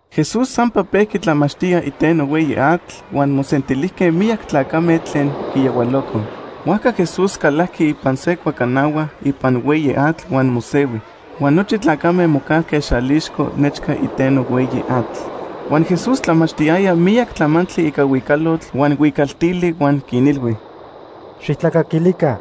Jesús sampa pejqui tlamachtía iteno hueyi atl, huan mosentilijque miyac tlacame tlen quiyahualocoj. Huajca Jesús calajqui ipan se cuacanahua ipan hueyi atl huan mosehui, huan nochi tlacame mocajque xalixco nechca iteno hueyi atl. Huan Jesús tlamachtiyaya miyac tlamantli ica huicalotl huan huicaltili huan quinilhui: “¡Xijtlacaquilica!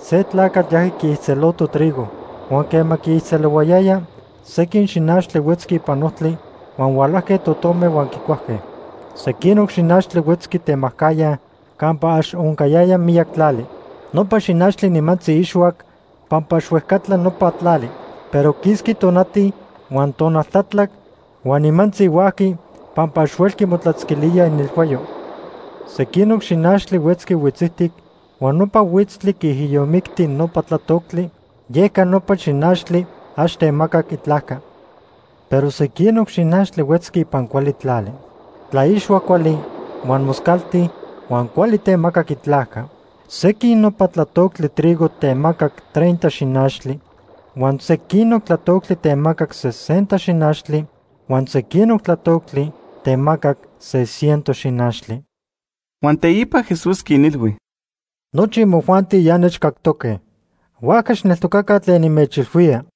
Se tlacatl yajqui quiijtzeloto trigo. Huan quema quiijtzelohuayaya, sequin xinachtli huetzqui ipan ojtli huan hualajque totome huan quicuajque. Sequinoc xinachtli huetzqui temajcajya campa ax oncayaya miyac tlali. Nopa xinachtli nimantzi ixhuac pampa ax huejcatla nopa tlali. Pero quisqui tonati, huan tonal tlatlac huan nimantzi huajqui pampa ax huelqui motlatzquilía inelhuayo. Sequinoc xinachtli huetzqui huitzijtic huan nopa huitztli quiijiyomicti nopa tlatoctli, yeca nopa xinachtli ax temacac itlajca. Pero sequinoc xinachtli huetzqui ipan cuali tlali. Tlaixhuac cuali, huan moscalti huan cuali temacac itlajca. Sequin nopa tlatoctli trigo temacac treinta xinachtli, huan sequinoc tlatoctli temacac sesenta xinachtli huan sequinoc tlatoctli temacac se ciento xinachtli.” Huan teipa Jesús quinilhui: “Nochi imojuanti ya innechcactoque. Huajca xijneltocaca tlen nimechilhuía.”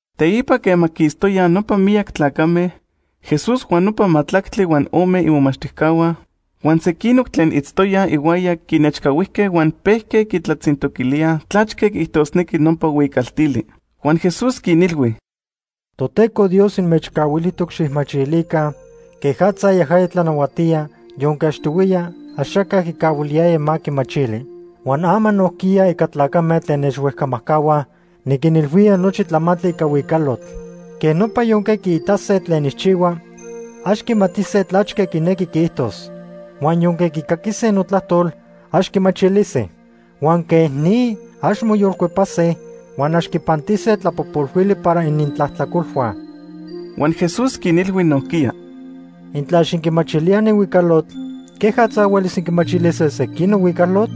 Teipa quema quistoyaj nopa miyac tlacame, Jesús huan nopa majtlactli huan ome imomachtijcahua huan sequinoc tlen itztoyaj ihuaya quinechcahuijque huan pejque quitlatzintoquilíaj tlachque quiijtosnequi nopa huicaltili. Huan Jesús quinilhui: “Toteco Dios inmechcahuilijtoc xijmachilica quejatza yajaya tlanahuatía yonque achtohuiya axaca quicahuiliyaya ma quimachili. Huan ama nojquiya ica tlacame tlen nechhuejcamajcahuaj, niquinilhuía nochi tlamantli ica huicalotl. Quej nopa yonque quiitase tlen nijchihua, ax quimatise tlachque quinequi quiijtos. Huan yonque quicaquise notlajtol, ax quimachilise. Huan quej ni ax moyolcuepase, huan ax quipantise tlapojpolhuili para inintlajtlacolhua.” Huan Jesús quinilhui nojquiya: “¿Intla ax inquimachilíaj ni huicalotl, quejatza huelis inquimachilise sequinoc huicalotl?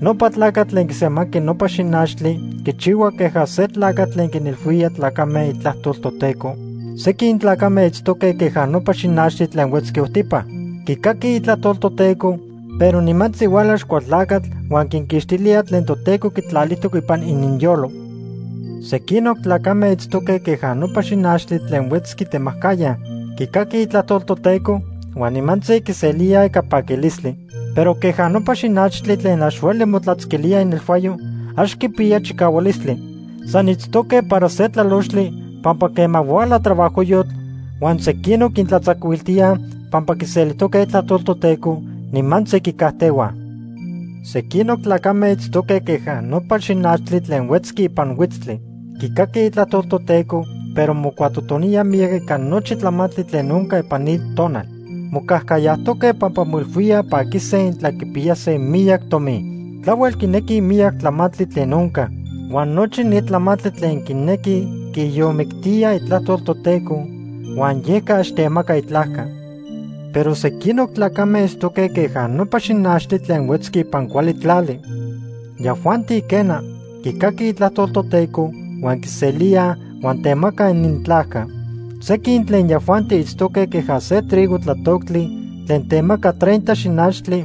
Nopa tlacatl tlen quisemanqui nopa xinachtli quichihua queja se tlacatl tlen quinilhuía tlacame itlajtol Toteco. Sequin tlacame itztoque queja nopa xinachtli tlen huetzqui ojtipa. Quicaquij itlajtol Toteco, pero nimantzi huala Axcualtlacatl huan quinquixtilía tlen Toteco quitlalijtoc ipan ininyolo. Sequinoc tlacame itztoque queja nopa xinachtli tlen huetzqui temajcajya. Quicaquij itlajtol Toteco huan nimantzi quiselíaj ica paquilistli. Pero queja nopa xinachtli tlen ax hueli motlatzquilía inelhuayo, ax quipiyaj chicahualistli. San itztoque para se tlalochtli, pampa quema huala trabajojyotl huan sequinoc quintlatzacuiltíaj pampa quiselijtoque itlajtol Toteco, nimantzi quicajtehuaj. Sequinoc tlacame itztoque queja nopa xinachtli tlen huetzqui ipan huitztli. Quicaquij itlajtol Toteco, pero mocuatotoníaj miyac ica nochi tlamantli tlen onca ipan ni tonal. Mocajcayajtoque pampa moilhuíaj paquise intla quipiyase miyac tomi. Tlahuel quinequij miyac tlamantli tlen onca. Huan nochi ni tlamantli tlen quinequij quiijiyomictíaj itlajtol Toteco, huan yeca ax temaca itlajca. Pero sequinoc tlacame itztoque queja nopa xinachtli tlen huetzqui ipan cuali tlali. Yajuanti, quena, quicaquij itlajtol Toteco, huan quiselíaj huan temacaj inintlajca. Sequin tlen yajuanti itztoque queja se trigo tlatoctli tlen temaca treinta xinachtli,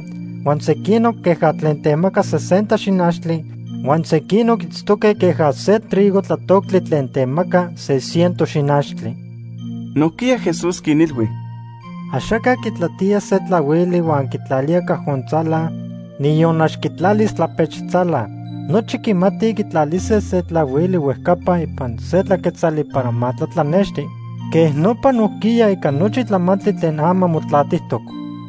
huan sequinoc queja tlen temaca sesenta xinachtli, huan sequinoc itztoque queja se trigo tlatoctli tlen temaca se ciento xinachtli.” Nojquiya Jesús quinilhui: “Axaca quitlatía se tlahuili huan quitlalía cajon tzala, niyon ax quitlalis tlapech tzala. Nochi quimatij quitlalise se tlahuili huejcapa ipan se tlaquetzali para ma tlatlanexti. Quej nopa nojquiya ica nochi tlamantli tlen ama motlatijtoc.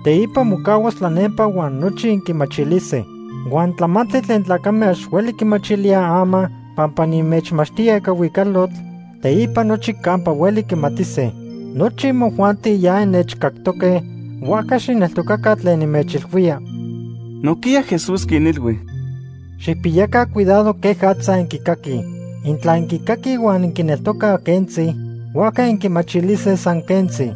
Teipa mocahuas tlanempa huan nochi inquimachilise. Huan tlamantli tlen tlacame ax hueli quimachilíaj ama pampa nimechmachtía ica huicalotl, teipa nochi campa hueli quimatise. Nochi imojuanti ya innechcactoque, huajca xijneltocaca tlen nimechilhuía.” Nojquiya Jesús quinilhui: “Xijpiyaca cuidado quejatza inquicaquij. Intla inquicaquij huan inquineltocaj quentzi, huajca inquimachilise san quentzi.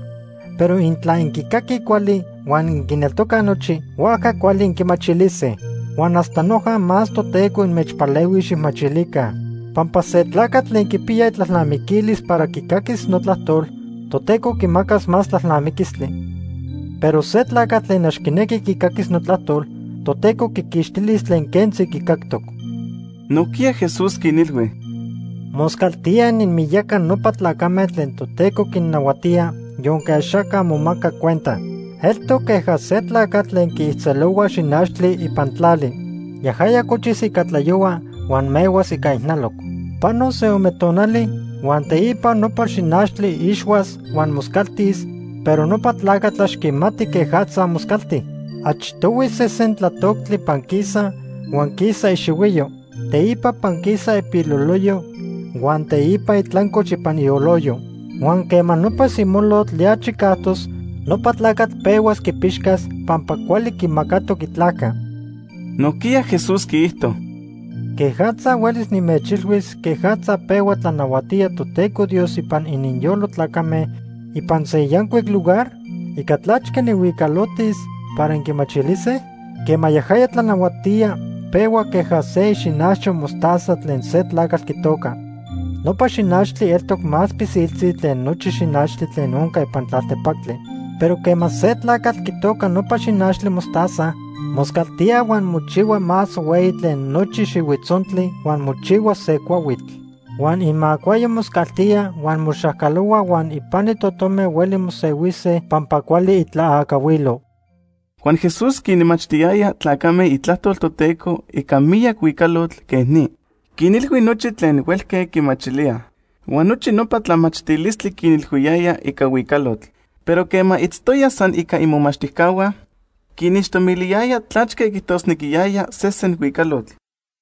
Pero intla inquicaquij cuali huan inquineltocaj nochi, huajca cuali inquimachilise. Huan hasta noja más Toteco inmechpalehuis xijmachilica. Pampa se tlacatl tlen quipiya itlalnamiquilis para quicaquis notlajtol, Toteco quimacas más tlalnamiquistli. Pero se tlacatl tlen ax quinequi quicaquis notlajtol, Toteco quiquixtilis tlen quentzi quicactoc.” Nojquiya Jesús quinilhui: “Moscaltía ininmiyaca nopa tlacame tlen Toteco quinnahuatía yonque axaca momaca cuenta. Eltoc queja se tlacatl tlen quiijtzelohua xinachtli ipan tlali. Yajaya cochis ica tlayohua huan mehuas ica ijnaloc. Panos se ome tonali huan teipa nopa xinachtli ixhuas huan moscaltis, pero nopa tlacatl ax quimati quejatza moscalti. Achtohui sesen tlatoctli panquisa, huan quisa ixihuiyo. Teipa panquisa ipiloloyo huan teipa itlancoch ipan ioloyo. Huan quema nopa simolotl ya chicajtos, nopa tlacatl pehuas quipixcas pampa cuali quimacatoc itlajca.” Nojquiya Jesús quiijto: “¿Quejatza huelis nimechilhuis quejatza pehua tlanahuatía Toteco Dios ipan ininyolo tlacame ipan se yancuic lugar? ¿Ica tlachque nijhuicalotis para inquimachilise? Quema yajaya tlanahuatía, pehua queja se ixinajcho mostaza tlen se tlacatl quitoca. Nopa xinachtli eltoc más pilsiltzi tlen nochi xinachtli tlen onca ipan tlaltepactli. Pero quema se tlacatl quitoca nopa xinachtli mostaza, moscaltía huan mochihua más hueyi tlen nochi xihuitzontli huan mochihua se cuahuitl. Huan imacuayo moscaltía huan moxacalohua huan ipani totome hueli mosehuise pampa cuali itlaacahuilo.” Huan Jesús quinmachtiyaya tlacame itlajtol Toteco ica miyac huicalotl quej ni. Quinilhui nochi tlen huelque quimachilíaj. Huan nochi nopa tlamachtilistli quinilhuiyaya ica huicalotl. Pero quema itztoya san ica imomachtijcahua, quinixtomiliyaya tlachque quiijtosnequiyaya sesen huicalotl.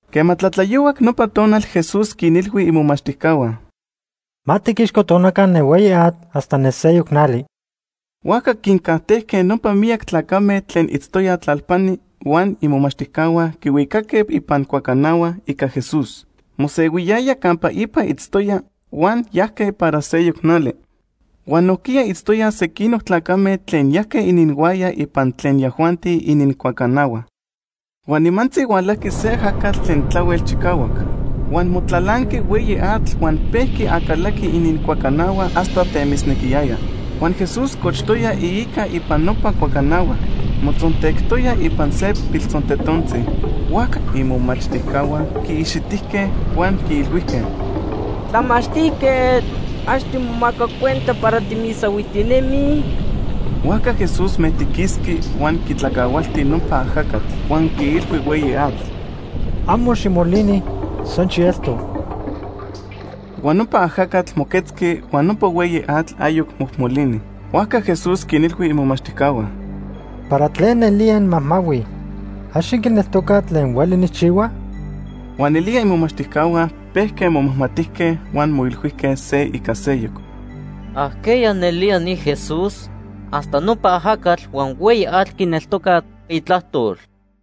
Quema tlatlayohuac nopa tonal, Jesús quinilhui imomachtijcahua: ―Ma tiquixcotonaca ne hueyi atl hasta ne seyoc nali. Huajca quincajtejque nopa miyac tlacame tlen itztoyaj tlalpani huan imomachtijcahua quihuicaque ipan cuacanahua ica Jeús mosehuiyaya campa ipa itztoya huan yajque para seyoc nali. Huan nojquiya itztoyaj sequinoc tlacame tlen yajque ininhuaya ipan tlen yajuanti inincuacanahua. Huan nimantzi hualajqui se ajacatl tlen tlahuel chicahuac. Huan motlalanqui hueyi atl huan pejqui acalaqui inincuacanahua hasta temisnequiyaya. Huan Jesús cochtoya iica ipan nopa cuacanahua, motzontectoya ipan se piltzontetontzi. Huajca imomachtijcahua quiixitijque huan quiilhuijque: ―¡Tlamachtijquetl! ¿Ax timomaca cuenta para timisahuijtinemij? Huajca Jesús mejtiquisqui huan quitlacahualti nopa ajacatl huan quiilhui hueyi atl: ―Amo ximolini, san xielto. Huan nopa ajacatl moquetzqui huan nopa hueyi atl ayoc mojmolini. Huajca Jesús quinilhui imomachtijcahua: ―¿Para tlen nelía inmajmahuij? ¿Ax inquineltocaj tlen hueli nijchihua? Huan nelía imomachtijcahua pejque momajmatijque huan moilhuijque se ica seyoc: ―¿Ajqueya nelía ni Jesús? Hasta nopa ajacatl huan hueyi atl quineltocaj itlajtol.